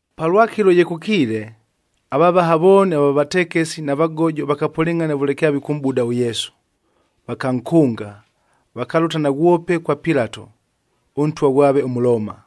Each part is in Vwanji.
Palwakɨlo ye kʉkiile, avavaha vooni ava vatekesi na vagojo vakapʉlɨngʼhana vʉle kyavikʉmʼbuda ʉYesu. Vakankʉnga, vakalʉta naghwope kwa Pilato, ʉntwa ghwave ʉMʉlooma.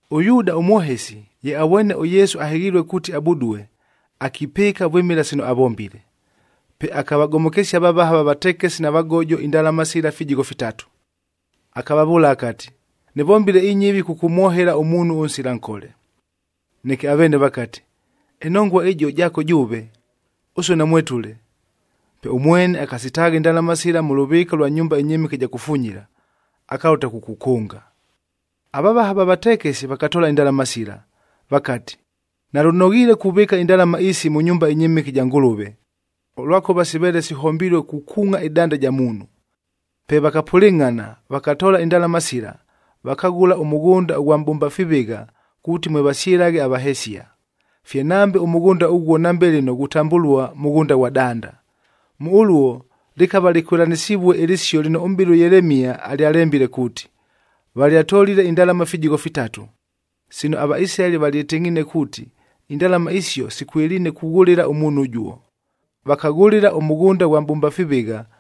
ɄYuuda ʉmwohesi, ye avwene ʉYesu ahɨghilue kuuti abudue, akipɨɨka vwɨmɨla sino avombile. Pe akavagomokesia avavaha va vatekesi na vagojo indalama sila fijigho fitatu. Akavavʉʉla akati, “Nɨvombile inyɨvi kʉkʉmwohela ʉmuunhu ʉnsila nkole.” Neke aveene vakati, “Ɨnongua ɨjio jaako jʉʉve, ʉsue namwetʉle.” Pe ʉmwene akasitaagha indalama sila mʉ lʉvɨɨka lwa nyumba ɨnyɨmɨke ɨja kufunyila, akalʉta kukukʉnga. Avavaha va vatekesi vakatoola indalama sila, vakati, “Nalʉnoghiile kuvɨɨka indalama isi mʉ nyumba ɨnyɨmɨke ɨja Ngʉlʉve, ʉlwakʉva siveele sihombilue kukuungʼa ɨdanda ja muunhu.” Pe vakapʉlɨngʼhana, vakatoola indalama sila, vakaghʉla ʉmʉghʉnda ʉghwa mʼbʉmba fivɨgha kuuti mwe vasyɨlaghe avahesia. Fye nambe ʉmʉghʉnda ʉghuo nambe lɨno ghutambʉlua Mʉghʉnda ghwa Danda. Mʉ ʉluo lɨkava lɨkwɨlanɨsivue ɨlɨsio lɨno ʉmʼbɨli ʉYelemia alyalembile kuuti, “Valyatolile indalama ifijigho fitatu, sino aVaisilaeli valyɨtɨngʼhiine kuuti indalama isio sikwɨliine kughʉlɨla ʉmuunhu ʉjuo. Vakaghʉlɨla ʉmʉghʉnda ghwa mʼbʉmba fivɨgha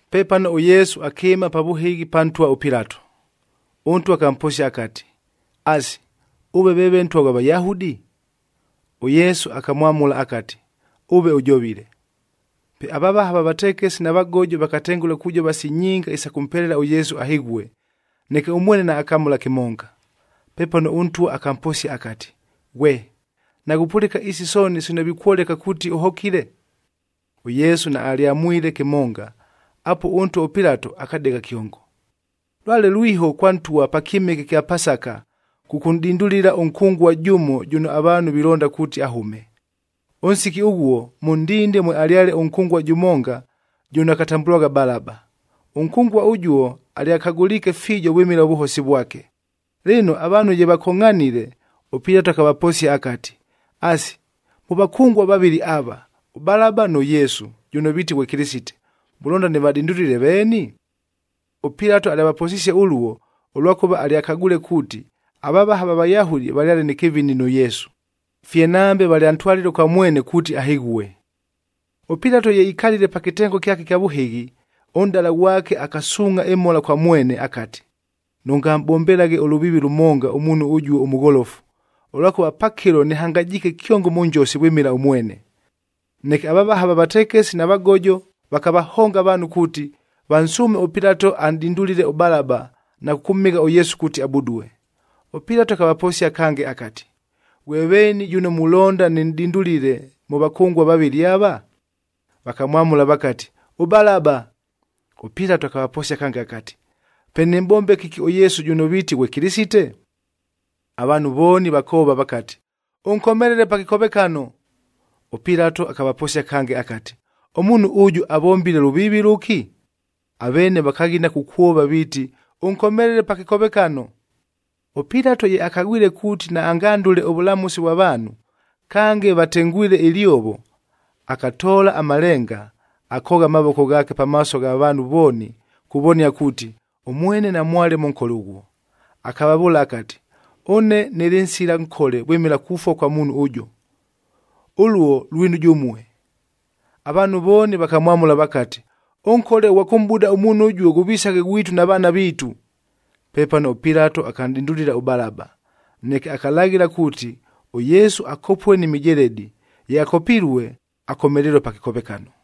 Pepano ʉYesu akɨɨma pa vʉhɨghi pa ntwa ʉPilato. Ʉntwa akamposia akati, “Asi, ʉve veeve Ntwa ghwa Vayahudi?” ɄYesu akamwamʉla akati, “Ʉve ʉjovile.” Pe avavaha va vatekesi na vagojo vakatengʉla kujova si nyinga isa kʉmpelela ʉYesu ahɨghue, neke ʉmwene naakamʉla kɨmonga. Pepano ʉntwa akamposia akati, “Ghwe! Naghupʉlɨka isi sooni sino vikwoleka kuuti ʉhokile?” ɄYesu naalyamwamwile kɨmonga. Apuo ʉntwa ʉPilato akadegha kyongo. Lwale lwiho kwa ntwa pa kyɨmɨke ɨkya Pasaka kʉkʉnʼdindulila ʉnkʉngua jʉmo jʉno avaanhu vilonda kuuti ahʉme. Ʉnsiki ʉghuo, mʉ ndinde mwealyale ʉnkʉngua jʉmonga jʉno akatambʉlwagha Balaba. Ʉnkʉngua ʉjuo alyakagʉliike fiijo vwɨmɨla ʉvʉhosi vwake. Lɨno, avaanhu ye vakongʼhanile, ʉPilato akavaposia akati, “Asi, mʉ vakʉngua vavɨlɨ ava, ʉBalaba nʉ Yesu jʉno viiti ghwe Kɨlɨsite, mulonda nɨvadindulile veeni?” ɄPilato alyavaposisie ʉluo, ʉlwakʉva alyakagwile kuuti avavaha va Vayahudi valyale nɨ kɨvini nʉ Yesu, fye nambe valyantwalile kwa mwene kuuti ahɨghue. ɄPilato ye ikalile pa kɨtengo kyake ɨkya vʉhɨghi, ʉnʼdala ghwake akasuungʼha ɨmhola kwa mwene akati, “Nʉngamʼbombelaghe ʉlʉviivi lʉmonga ʉmuunhu ʉjuo ʉmʉgholofu, ʉlwakʉva pakɨlo nɨhangajiike kyongo mʉ njosi vwɨmɨla ʉmwene.” Neke avavaha va vatekesi na vagojob vakavahonga avaanhu kuuti, vansʉʉme ʉPilato anʼdindulile ʉBalaba na kʉkʉmhɨgha ʉYesu kuuti abudue. ɄPilato akavaposia kange akati, “Ghwe veeni jʉno mulonda nɨnʼdindulile mʉ vakʉngua vavɨlɨ ava?” Vakamwamʉla vakati, “ɄBalaba.” ɄPilato akavaposia kange akati, “Pe nɨmʼbombe kɨki ʉYesu jʉno viiti ghwe Kɨlɨsite?” Avaanhu vooni vakoova vakati, “Ʉnkomelele pa kɨkovekano!” ɄPilato akavaposia kange akati, “Ʉmuunhu ʉjʉ avombile lʉviivi lʉki?” Aveene vakaghina kukwova viiti, “Ʉnkomelele pa kɨkovekano!” ɄPilato ye akagwile kuuti naangandʉle ʉvʉlamʉsi vwa vaanhu, kange vatengwile ɨlyovo, akatoola amalenga, akoogha amavoko ghaake pamaaso gha vaanhu vooni kuvonia kuuti, ʉmwene namwale mʉ nkole ʉghuo. Akavavʉʉla akati, “Ʉne nɨlɨ nsila nkole vwɨmɨla kufua kwa muunhu ʉjʉ. Ʉluo lwinu jʉmue.” Avaanhu vooni vakamwamʉla vakati, “Ʉnkole ʉghwa kʉmʼbuda ʉmuunhu ʉjuo ghʉvisaghe ghwitu na vaana viitu!” Pepano ʉPilato akanʼdindulila ʉBalaba, neke akalaghɨla kuuti, ʉYesu akopue ni mijeledi, ye akopilue, akomelelue pa kɨkovekano.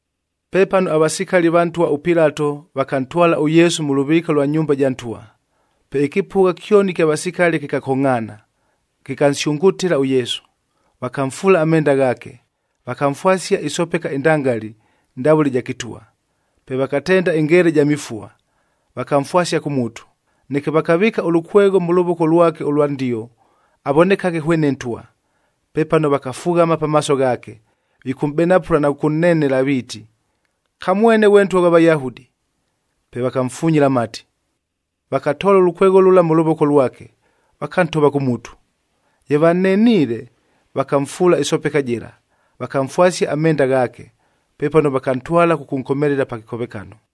Pepano avasikali va ntwa ʉPilato vakantwala ʉYesu mʉ lʉvɨɨka lwa nyumba ja ntwa, pe ɨkɨpʉgha kyoni ɨkya vasikali kɨkakongʼhaana, kɨkansyʉngʉtɨla ʉYesu. Vakamfuula amenda ghaake, vakamfwasia ɨsopeka ɨndangali, ndavʉle ɨja kɨtwa. Pe vakatenda ɨngeela ɨja mifua, vakamfwasia kʉ mutu, neke vakavɨɨka ʉlʉkwegho mʉ lʉvoko lwake ʉlwa ndio avonekaghe hwene ntwa. Pepano vakafughama pamaaso ghaake, vikʉmʼbenapʉla na kʉkʉnnenela viiti, “Kamwene ghwe Ntwa ghwa Vayahudi!” Pe vakamfunyila amati. Vakatoola ʉlʉkwegho lʉla mʉ lʉvoko lwake, vakantova kʉ mutu. Ye vanneniile, vakamfuula ɨsopeka jɨla, vakamfwasia amenda ghaake. Pepano vakantwala kʉkʉnkomelela pa kɨkovekano.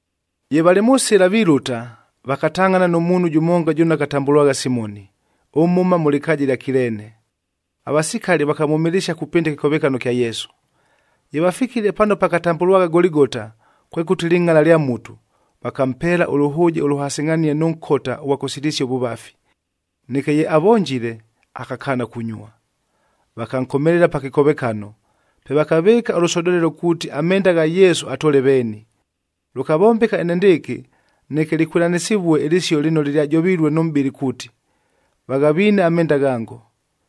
Ye valɨ mʉ sɨla vilʉta, vakatangʼhana nʉ muunhu jʉmonga jʉno akatambʉlwagha Simoni, ʉmhʉma mʉ lɨkaaja ɨlya Kileene. Avasikali vakamwʉmɨlɨsia kupɨnda ɨkɨkovekano kya Yesu. Ye vafikile pano pakatambʉlwagha Goligota, kwekʉti, Lɨngʼala lya Mutu, vakampeela ʉlʉhʉʉje ʉlʉhasɨngʼhanie nʉ nkota ʉghwa kʉsilisia ʉvʉvafi. Neke ye avonjile, akakaana kunyua. Vakankomelela pa kɨkovekano, pe vakavɨɨka ʉlʉsodolelo kuuti amenda gha Yesu atoole veeni. Lʉkavombeka enendɨɨkɨ, neke lɨkwɨlanɨsivue ɨlɨsio lɨno lɨlyajovilue nʉ mʼbɨli kuuti, “Vaghaviine amenda ghango,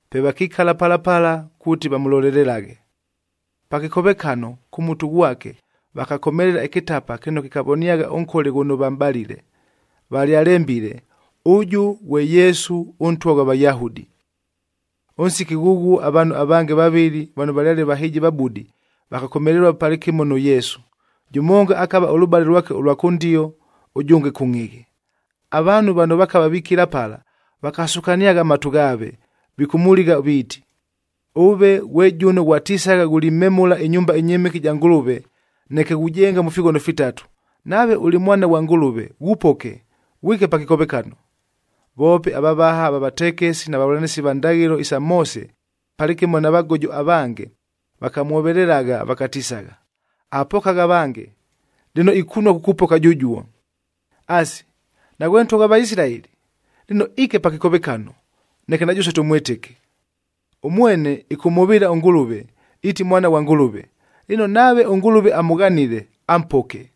Pe vakikala pala pala kuuti vamʉlolelelaghe. Pa kɨkovekano, kʉ mutu ghwake vakakomelela ɨkɨtapa kɨno kɨkavoniagha ʉnkole ghʉno vamʼbalile, valyalembile, “ɄJɄ GHWE YESU, ɄNTWA GHWA VAYAHUDI.” Ʉnsiki ghʉghuo avaanhu avange vavɨlɨ vano valyale vahɨjivabudi vakakomelelua palɨkɨmo nʉ Yesu, jʉmonga akava ʉlʉbale lwake ʉlwa kʉndio, ʉjʉnge kʉngʼhɨghɨ. Avaanhu vano vakava vikila pala vakasukaniagha amatu ghaave, vikʉmʉligha viiti, “Ʉve ghwe jʉno ghwatisagha ghulimemʉla ɨnyumba ɨnyɨmɨke ɨja Ngʉlʉve, neke ghujenga ifighono fitatu, nave ʉlɨ Mwana ghwa Ngʉlʉve, ghupoke, ghwike pa kɨkovekano!” Voope avavaha va vatekesi na vavʉlanɨsi va ndaghɨlo isa Moose palɨkɨmo na vagojo avange vakamwovelelagha vakatisagha, “Avapokagha avange, lɨno ikunua kukupoka jʉjuo! Asi, naghwe Ntwa ghwa Vaisilaeli! Lɨno iike pa kɨkovekano, neke na jʉsue tʉmwɨtɨke. Ʉmwene ɨkʉmhʉvɨɨla ʉNgʉlʉve, iiti Mwana ghwa Ngʉlʉve, lɨno nave ʉNgʉlʉve amʉghanile, ampoke.”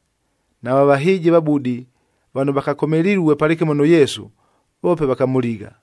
Nava vahɨjivabudi vano vakakomelilue palɨkɨmo nʉ Yesu, voope vakamʉligha.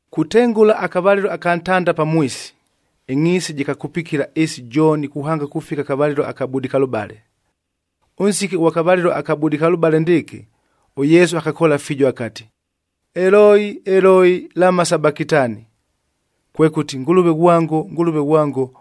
Kutengʉla akavalɨlo aka ntanda pamwisi, ɨngʼhiisi jɨkakupikila ɨɨsi jooni kuhanga kufika akavalɨlo aka budikalʉbale. Ʉnsiki ʉghwa kavalɨlo aka budikalʉbale ndɨɨkɨ ʉYesu akakoola fiijo akati, “Eloi, Eloi, lama sabakitani?” Kwekʉti, “Ngʉlʉve ghwango, Ngʉlʉve ghwango,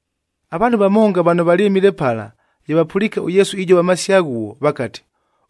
Avaanhu vamonga vano valyɨmile pala ye vapʉliike ʉYesu ijova amasio aghuo, vakati,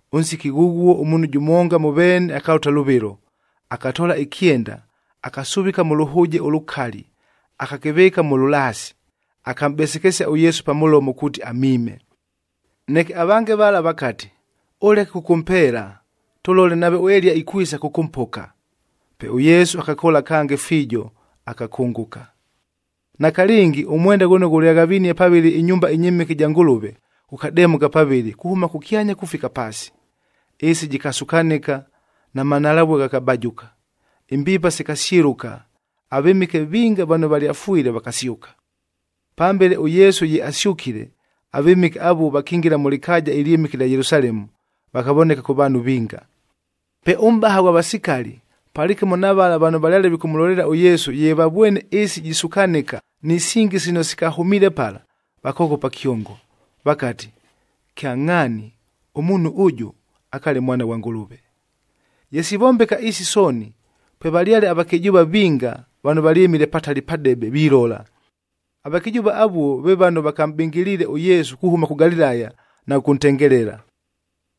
Ʉnsiki ghʉghuo ʉmuunhu jʉmonga mʉ veene akalʉta lʉvɨlo, akatoola ɨkyenda, akasuvika mʉ lʉhʉʉje ʉlʉkali, akakɨvɨɨka mʉ lʉlaasi, akamʼbesekesia ʉYesu pa mʉlomo kuuti amiime. Neke avange vala vakati, “Ʉleke kʉkʉmpeela, tʉlole nave ʉEliya ikwisa kʉkʉmpoka!” Pe ʉYesu akakoola kange fiijo, akakʉngʉka. Nakalɨngi, ʉmwendag ghʉno ghʉlyaghavinie pavɨlɨ ɨnyumba ɨnyɨmɨke ɨja Ngʉlʉve,h ghʉkademʉka pavɨlɨ kuhʉma kʉkyanya kufika paasi. Ɨɨsi jɨkasukanɨka na manhalavue ghakabajʉka. Imbiipa sikasyɨlʉka, avɨmɨke vinga vano valyafwile vakasyʉka. Pambele ʉYesu ye asyʉkile, avɨmɨke avuo vakingila mʉ lɨkaaja ɨlyɨmɨke ɨlya Yelusalemu, vakavoneka kʉ vaanhu vinga. Pe ʉmʼbaha ghwa vasikalii palɨkɨmo na vala vano valyale vikʉmʉlolelela ʉYesu ye vavwene ɨɨsi jisukanɨka ni singi sino sikahʉmiile pala, vakoghopa kyongo, vakati, “Kyangʼhaani, ʉmuunhu ʉjʉ akaale Mwana ghwa Ngʉlʉve!” Ye sivombeka isi sooni, pwevalyale avakɨjʉʉva vinga vano valyɨmile patali padebe vilola. Avakɨjʉʉva avuo ve vano vakamʼbɨngɨliile ʉYesu kuhʉma kʉ Galilaya na kʉkʉntengelela.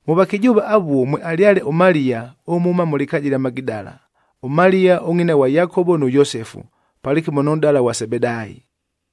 Mʉ vakɨjʉʉva avuo, mwealyale ʉMaliya ʉmhʉma mʉ lɨkaaja ɨlya Magidala, ʉMaliya ʉngʼina ghwa Yakovo nʉ Yosefu palɨkɨmo nʉ nʼdala ghwa Sebedaayi.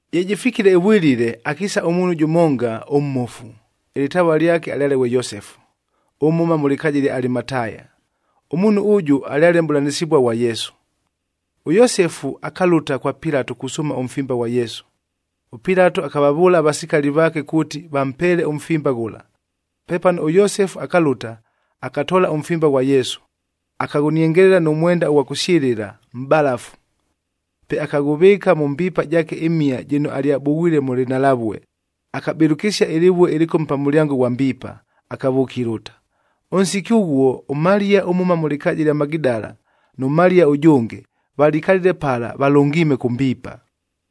Ye jɨfikile ɨvwilile, akiisa ʉmuunhu jʉmonga ʉmmofu, ɨlɨtavua lyake alyale ghwe Yosefu, ʉmhʉma mʉ lɨkaaja ɨlya Alimataya. Ʉmuunhu ʉjʉ alyale mʼbʉlanɨsɨvua ghwa Yesu. ɄYosefu akalʉta kwa Pilato kusʉʉma ʉmfimba ghwa Yesu. ɄPilato akavavʉʉla avasikali vaake kuuti vampeele ʉmfimba ghʉla. Pepano ʉYosefu akalʉta, akatoola ʉmfimba ghwa Yesu, akaghʉniengelela nʉ mwenda ʉghwa kʉsyɨlɨla, mʼbalafu. Pe akaghʉvɨɨka mʉ mbiipa jaake ɨmhia jɨno alyabughwile mʉ lɨnhalavue, akabɨlʉkɨsia ɨlɨvue ɨlɨkome pa mʉlyango ghwa mbiipa, akavʉʉka ilʉta. Ʉnsiki ʉghuo ʉMaliya ʉmhʉma mʉ lɨkaaja ɨlya Magidala nʉ Maliya ʉjʉnge valikalile pala valʉngiime kʉ mbiipa.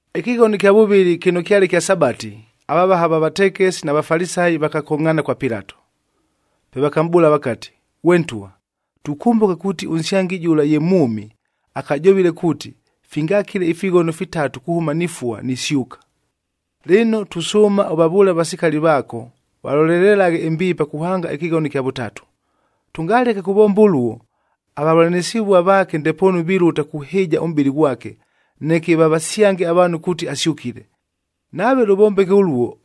Ɨkɨghono ɨkya vʉvɨlɨ kɨno kyale kya Sabati, avavaha va vatekesi na Vafalisayi vakakongʼhaana kwa Pilato. Pe vakamʼbʉʉla vakati, “Ghwe ntwa, tukʉmbʉka kuuti ʉnsyangi jʉla ye mwʉmi, akajovile kuuti, ‘Fingakile ifighono fitatu kuhʉma nifua, nisyʉka.’ Lɨno, tusʉʉma ʉvavʉʉle avasikali vaako valolelelaghe ɨmbiipa kuhanga ɨkɨghono ɨkya vʉtatu. Tʉngaleke kuvomba ʉluo, avavʉlanɨsɨvua vaake ndepoonu vilʉta kuhɨɨja ʉmʼbɨlɨ ghwake, neke vavasyange avaanhu kuuti asyʉkile. Nave lʉvombeke ʉluo,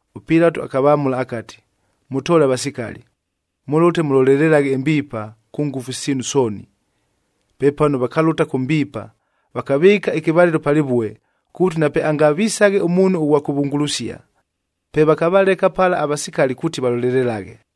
ɄPilato akavamʉla akati, “Mʉtoole avasikali. Mʉlʉte mʉlolelelaghe ɨmbiipa kʉ ngʉfu siinu sooni.” Pepano vakalʉta kʉ mbiipa, vakavɨɨka ɨkɨvalɨlo pa lɨvue, kuuti napeangavisaghe ʉmuunhu ʉghwa kʉvungulusia. Pe vakavaleka pala avasikali kuuti valolelelaghe.